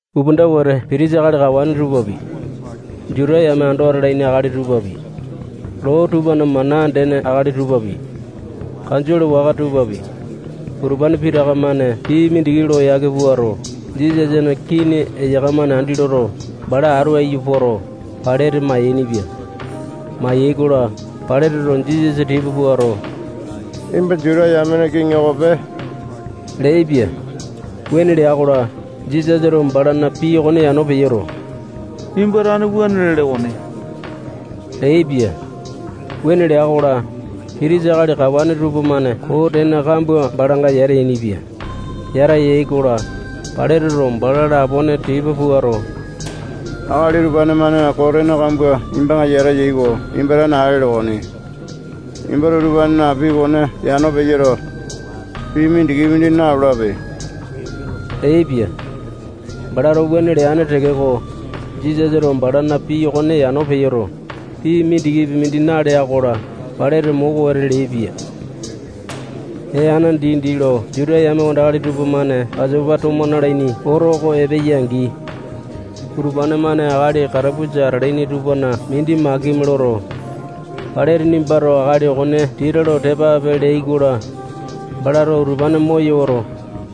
Upanda wete pitisa akali kawane tupapi, Juta yame ando atalaini akali tupapi, loo tupana mana andene akali tupapi, kanjole waka tupapi, utupane pitaka-mane pii mindiki lo yake puato, Jisasana kini eyaka-mane andi loto, bala atu aiyu poto, Pailate mayainipia. Mayai-kola, Pailateto Jisasa tipa puato, nimba Juta yamena kiŋi okope leaipia. Wuane lea-kola, Jisasato balana pii okone yano peyoto, nimba tane wuane lele okoni leaipia. Wuane lea-kola, pitisa akali kawane tupamane koo tene kambua balanga yata yainipia. Yata yai-kola, Pailateto bala lapone tipa puato, akali utupane-mane koo tene kambua nimbanga yata eya oko nimba tane ale ele okoni. Nimbato utupanena pii okone yano peyoto, pii mindikipi mindi nalolape leaipia. Balato wuane leane tekeko, Jisasato balana pii okone yano peyoto, pii mindikipi mindi nalea-kola, Pailate moko wete leaipia. Ee ana dindi lo Juta yame wandakali tupamane Pasopa tomo nalaini oto oko epeya-angi, utupane-mane akali katapusa atalaini tupana mindi makimi loto, Pailate nimbato akali okone tita lo tepa ape leai-kola, balato utupane moyoto,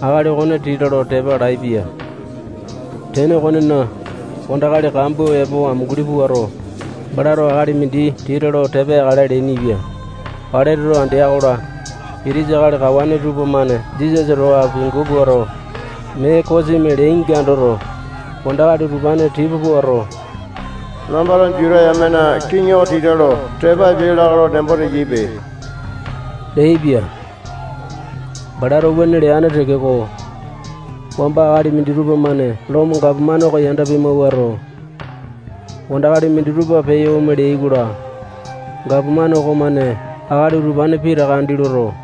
akali okone tita lo tepa alaepia. Tene okonena, wandakali kambua epo amunguli puato, balato akali mindi tita lo tepa yakale leainipia. Pailateto andea-kola, pitisa akali kawane tupamane Jisasa towa apiangu puato, mee kosimi leainga andoto, wandakali utupane tipa puato, nambato Juta yamena kiŋi oko tita lo tepa apia lakae lo nembo teyaipe leaipia. Balato wuane leane tekeko, wamba akali minditupa-mane Lomo gapomane oko yanda pimawuato, wandakali minditupa peyo ome leai-kola, gapomane okomane akali utupane pitaka andi loto,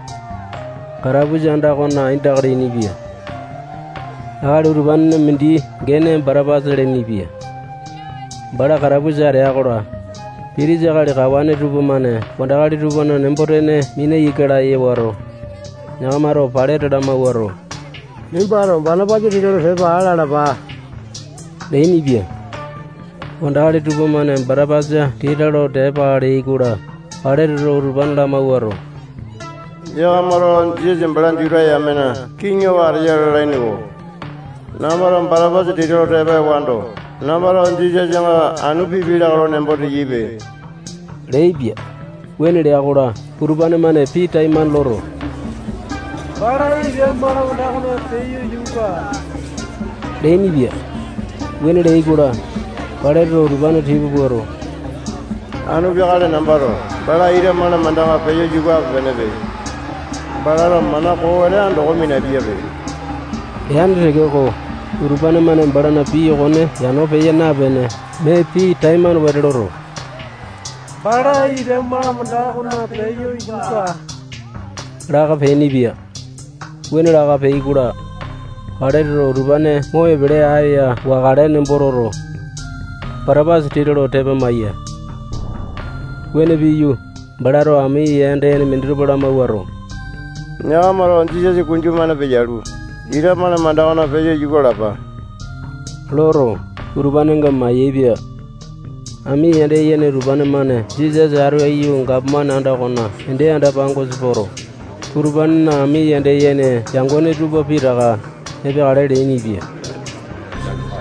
katapusa anda okona aindaka leainipia. Akali utupanena mindi gene Batapasa lenepia. Bala katapusa atea-kola, pitisa akali kawane tupamane wandakali tupana nembo-tene mina ika laya wato, yakamato Pailate lamawuato, nimbato Batapasa tita lo tepa aa lalapa leainipia. Wandakali tupamane Batapasa tita lo tepa aa leai-kola, Pailateto utupane lamawuato, yakamato Jisasa bala Juta yamena kiŋi oko ateya lalaini-ko. Nambato Batapasa tita lo tepa ewando, nambato Jisasanga anu pipia lakae lo nembo teyaipe leaipia. Wuane lea-kola, utupane-mane pii taimane loto, bala ita malamanda okona peyo yuka aa leainipia. Wuane leai-kola, Pailateto utupane tipa puato, anu peakale nambato bala ita malamandanga peyo yuka ape-penepe. Balato mana koo wete andoko minapiape leane tekeko, utupane-mane balana pii okone yano peya napene, mee pii taimane wete loto, bala ita malamanda okona peyo yuka aa laka peainipia. Wuane laka peai-kola, Pailateto utupane mo epele aya wakale nembo toto, Batapasa tita lo tepa amaiya. Wuane piyu, balato ami yanda yene minditupa lamawuato, yakamato Jisasa kunju-mane peyalu, ita malamanda okona peyo yuka alapa loto, utupanenga mayaepia. Ami yanda yene utupane-mane Jisasa atu aiyu gapomane anda okona ende anda-pangosa poto, utupanena ami yanda yene yangone tupa pitaka epeakale leainipia.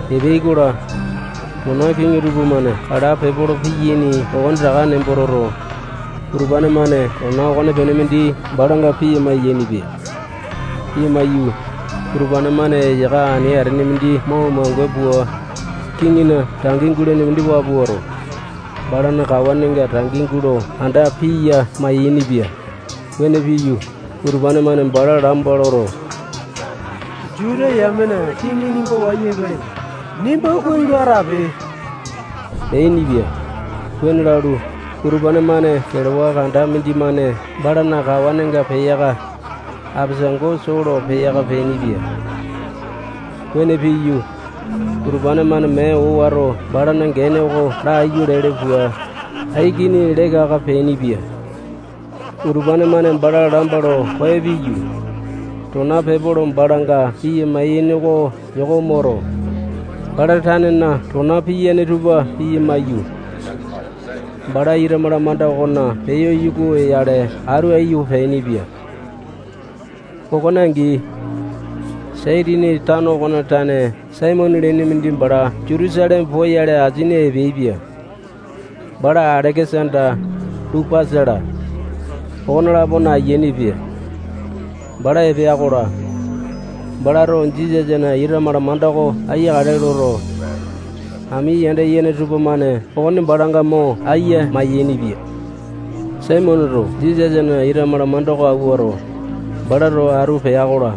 Epeai-kola, tona kiŋi tupamane kala pepolo piyaini okonetaka nembo toto, utupane-mane tona okonepene mindi balanga piya mayainipia. Piya maiyu, utupane-mane eyaka ani atene mindi mo umange pua, kiŋina tangi gulene mindi waa puato, balana kawanenga tangi gulo anda aiya mayainipia. Wuane piyu, utupane-mane bala lamba loto, Juta yamena kiŋi nimba wayu epeleya. Nimba kuai lo atape leainipia. Wuane lalu, utupane-mane kelewa kanda mindimane balana kawanenga peyaka, apesango soo lo peyaka peainipia. Wuane piyu, utupane-mane mee owato balana gene oko laiyu lele pua, aikini leka aka peainipia. Utupane-mane bala lamba lo koyo piyu, tona pepolo balanga piya mayaini oko yoko moto, bala tanena tona piyane tupa piya maiyu, bala ita malamanda okona peyo yuka oyale atu aiyu peainipia. Okone angi, Saitini tano okona tane Saimone lene mindi bala Jutusaleme poyale asini epeaipia. Bala Aleke-sanda, Lupasa-la, okone-lapona ayiane pia. Bala epea-kola, balato Jisasana ita malamanda oko aiyakale loto, ami yanda yene tupamane okone balanga mo aiya mayainipia. Saimoneto Jisasana ita malamanda oko awuato, bala towa atu pea-kola,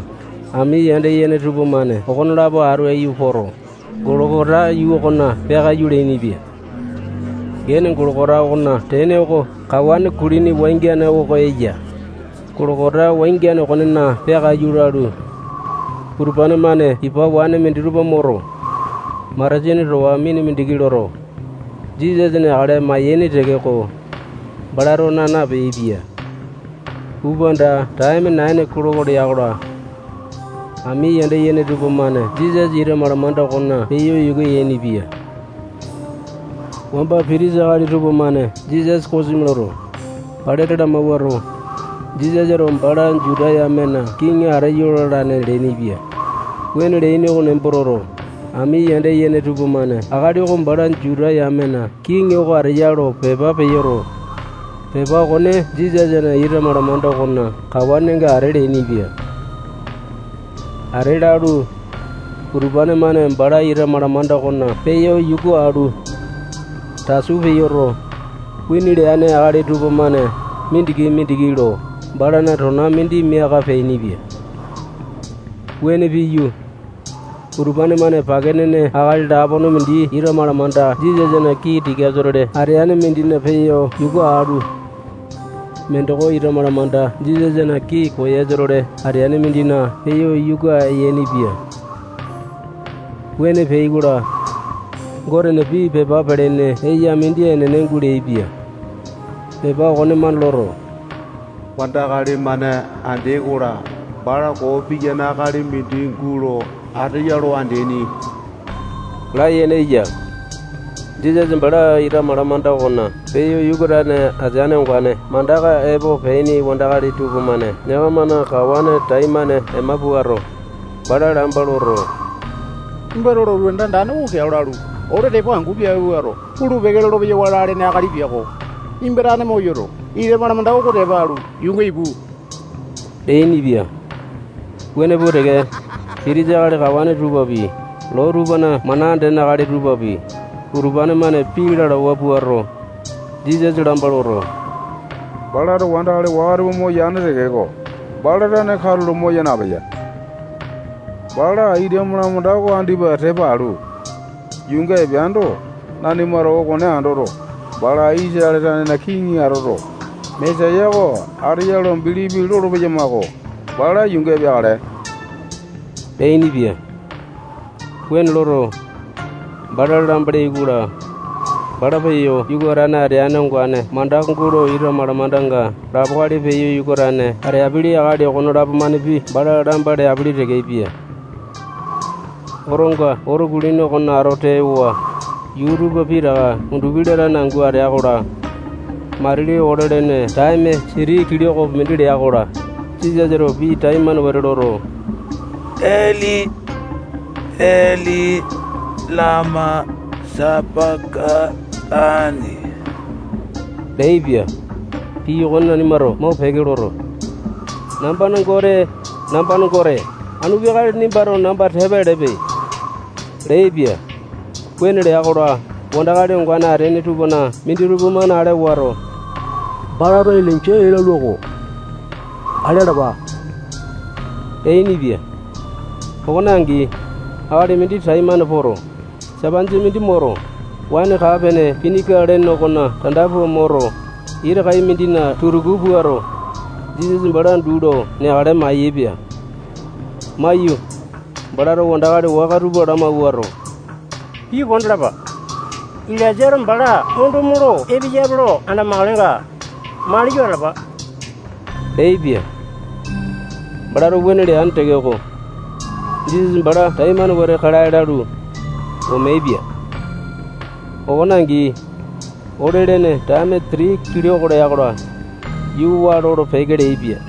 ami yanda yene tupamane okonelapo atu aiyu poto, Golokota yuu okona peakaiyu leainipia. Gene Golokota okona tene oko kawane kulini wangiane oko eya. Golokota wangiane okonena peakaiyu lalu, utupane-mane ipa waene minditupa moto, matasini towa mina mindiki loto, Jisasa neakale mayaini tekeko, balato naa napeaipia. Upanda taeme naini kiloko lea-kola, ami yanda yene tupamane Jisasa ita malamanda okona peyo yuka yainipia. Wamba pitisa akali tupamane Jisasa kosimi loto, Pailate lamawuato, Jisasato bala Juta yamena kiŋi ateyo lalane leainipia. Wuane leaini oko nembo toto, ami yanda yene tupamane akali oko bala Juta yamena kiŋi oko ateya lo pepa peyoto, pepa okone Jisasana ita malamanda okona kawanenga ate leainipia. Ate lalu, utupane-mane bala ita malamanda okona peyo yuka alu, tasu peyoto, wini leane akali tupamane mindiki-mindiki lo balana tona mindi miaka peainipia. Wuane piyu, utupane-mane pake nene akali lapona mindi ita malamanda Jisasana kii tikasa-tole ateane mindina peyo yuka alu, mindoko ita malamanda Jisasana kii koyasa-tole ateane mindina peyo yuka yainipia. [Wuane peai-kola, Gotena pii pepa pelene eya mindi enene guleaipia. Pepa okonemane loto, wandakali-mane andeai-kola, bala koo piyane akali mindi gulo ateya lo andeaini layene eya.] Jisasa bala ita malamanda okona peyo yuka atane ateane ongane mandaka epo peaini wandakali tupamane yakamana kawane taimane ema puato, bala lamba loto, nimbato lotu anda andane oko keao lalu, ole tepo angu piape puato, pulu-peke lolo-peyawa lalene akali piako. Nimba tane moyoto, ita malamanda oko tepa alu, yuunga ipu leainipia. Wuane pua teke, pitisa akali kawane tupapi, loo tupana mana andene akali tupapi, utupane-mane pii lalawa puato, Jisasa lamba loto, balato wandakali waka tupa moyane tekeko, bala tane katulo moya napeya. Bala ita malamanda oko andipa tepa alu, yuunga epeando, nanimato okone andoto, bala Isatale tanena kiŋi atoto, Mesaya oko ateya lo bilipi lolo-peyamako. Bala yuunga epeakale leainipia. Wuane loto, bala lamba leai-kola, bala peyo yuka atane ateane ongane mandaka gulo ita malamandanga lapo akali peyo yuka atane ateapili akali okonelapo-manepi bala lamba leapele tekepia. Otonga oto kulini okona ato tewa, yuu tupa pitaka undupi latane angu atea-kola, matili ole lene taeme siti kilokopi mindi lea-kola, Jisasato pii taimane wete loto, Eli, Eli, lama sapa-katani leaipia. Pii okone nanimato mopeke loto, nambana Gote, nambana Gote, anu peakale nimbato namba tepa elepe leaipia. Wuane lea-kola, wandakali ongane ateaini tupana minditupa-mane ale wato, balato Ilainja ee lalua-ko. Ale alapa leainipia. Okona angi, akali mindi taimane poto, sapanjia mindi moto, waene kaa-pene pinika lene okona tanda pua moto, ita kai mindina tutuku puato, Jisasa bala duu lo neakale mayaepia. Maiyu, balato wandakali waka tupa lamawuato, pii kondalapa. Ilainjato bala ondo molo epeyape lo andamakalenga, maliyo atalapa leaipia. Balato wuane leane tekeko, Jisasa bala taimane wete kalae lalu, omeaipia. Okone angi, ole-lene taeme siti kiloko lea-kola, yuu waa lolo-peke leaipia.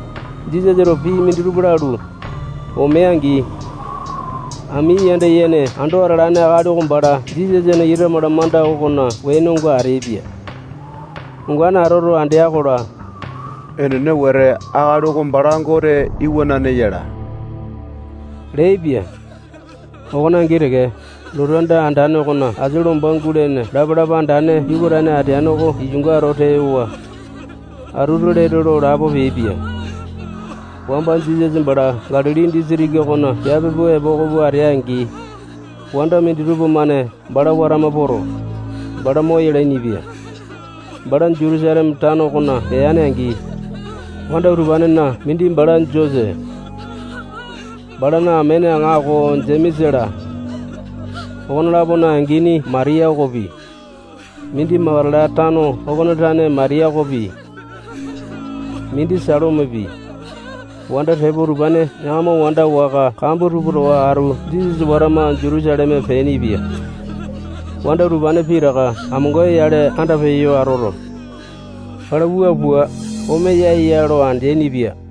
Jisasato pii minditupa lalu, omea-angi, ami yanda yene ando atalane akali oko bala Jisasana ita malamanda okona wenonga ateaipia. Ongane atoto andea-kola, enene wete, akali oko bala Gote Iwanane yala leaipia. Okone angi teke, lotu anda andane okona asia lomba gulene lapa-lapa andane yuka atane ateane oko iyunga ato tewa, atutu lete lo lapo peaipia. Wamba Jisasa bala Galili disitiki okona piape pua epoko pua atea-angi, wanda minditupa-mane bala watama poto, bala moyalaini-pia. Bala Jutusaleme tano okona peane-angi, wanda utupanena mindi bala Jose, balana amene aŋako Jemesa-la, okone-lapona angini Matiya okopi, mindi Makatala tano okona tane Matiya okopi, mindi Salomepi, wanda tepo utupane yakama wanda waka kambua tupa towa atu Jisasa watama Jutusaleme peainipia. Wanda utupane pitaka amonga-yale andapeyo atoto, bala wua pua omeya ya lo andeaini-pia.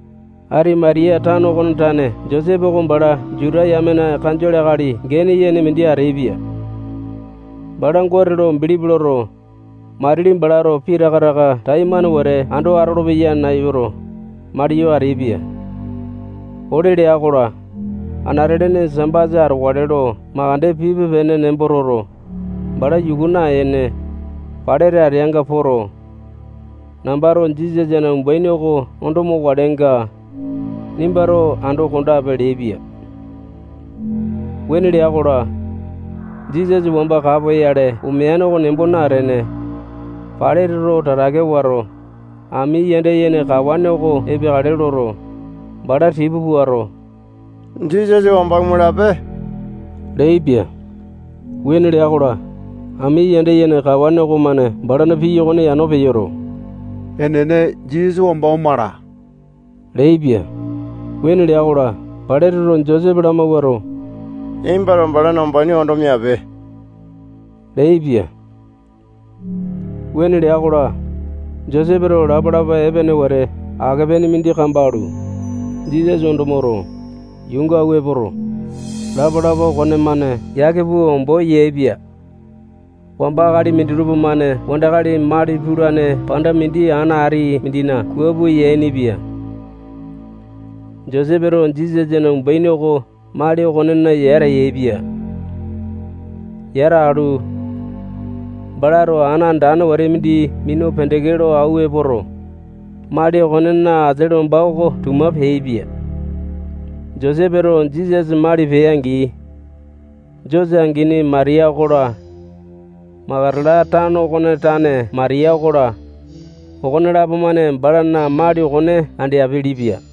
Atimatiya tano okona tane Josepe oko bala Juta yamena kanjole akali gene yene mindi ateaipia. Bala Gote lo bilipi loto, matili balato pitaka taka taimane wete ando atolopeya nayuto, maliyo ateaipia. Ole lea-kola, anate-lene Sambasa atokale lo mandeke pipe-pene nembo toto, bala yuku naene, Pailate ateanga poto, nambato Jisasana umbaini oko ondo mokalenga, nimbato ando kondape leaipia. Wuane lea-kola, Jisasa wamba kapoyale omeane oko nembo natene, Pailateto tatake wato, ami yanda yene kawane oko epeakale loto, bala tipa puato, Jisasa wamba omalape leaipia. Wuane lea-kola, ami yanda yene kawane okomane balana pii okone yano peyoto, enene, Jisasa wamba omala leaipia. Wuane lea-kola, Pailateto Josepe lamawuato, nimbato balana umbaini ondo miape leaipia. Wuane lea-kola, Josepeto lapa-lapa epene wete ake-pene mindi kambalu, Jisasa ondo moto, yuunga awua epoto, lapa-lapa okonemane yake pua ombo yaepia. Wamba akali minditupa-mane wandakali mali pulane panda mindi ana ati mindina kua pua yainipia. Josepeto Jisasana umbaini oko mali okonena yata yaepia. Yata alu, balato ana andane wete mindi minu pendeke lo awua epoto, mali okonena asia lomba oko tuma peaipia. Josepeto Jisasa mali pea-angi, Jose angini Matiya okola, Makatala tano okona tane Matiya okola, okonelapo-mane balana mali okone andeapele-pia.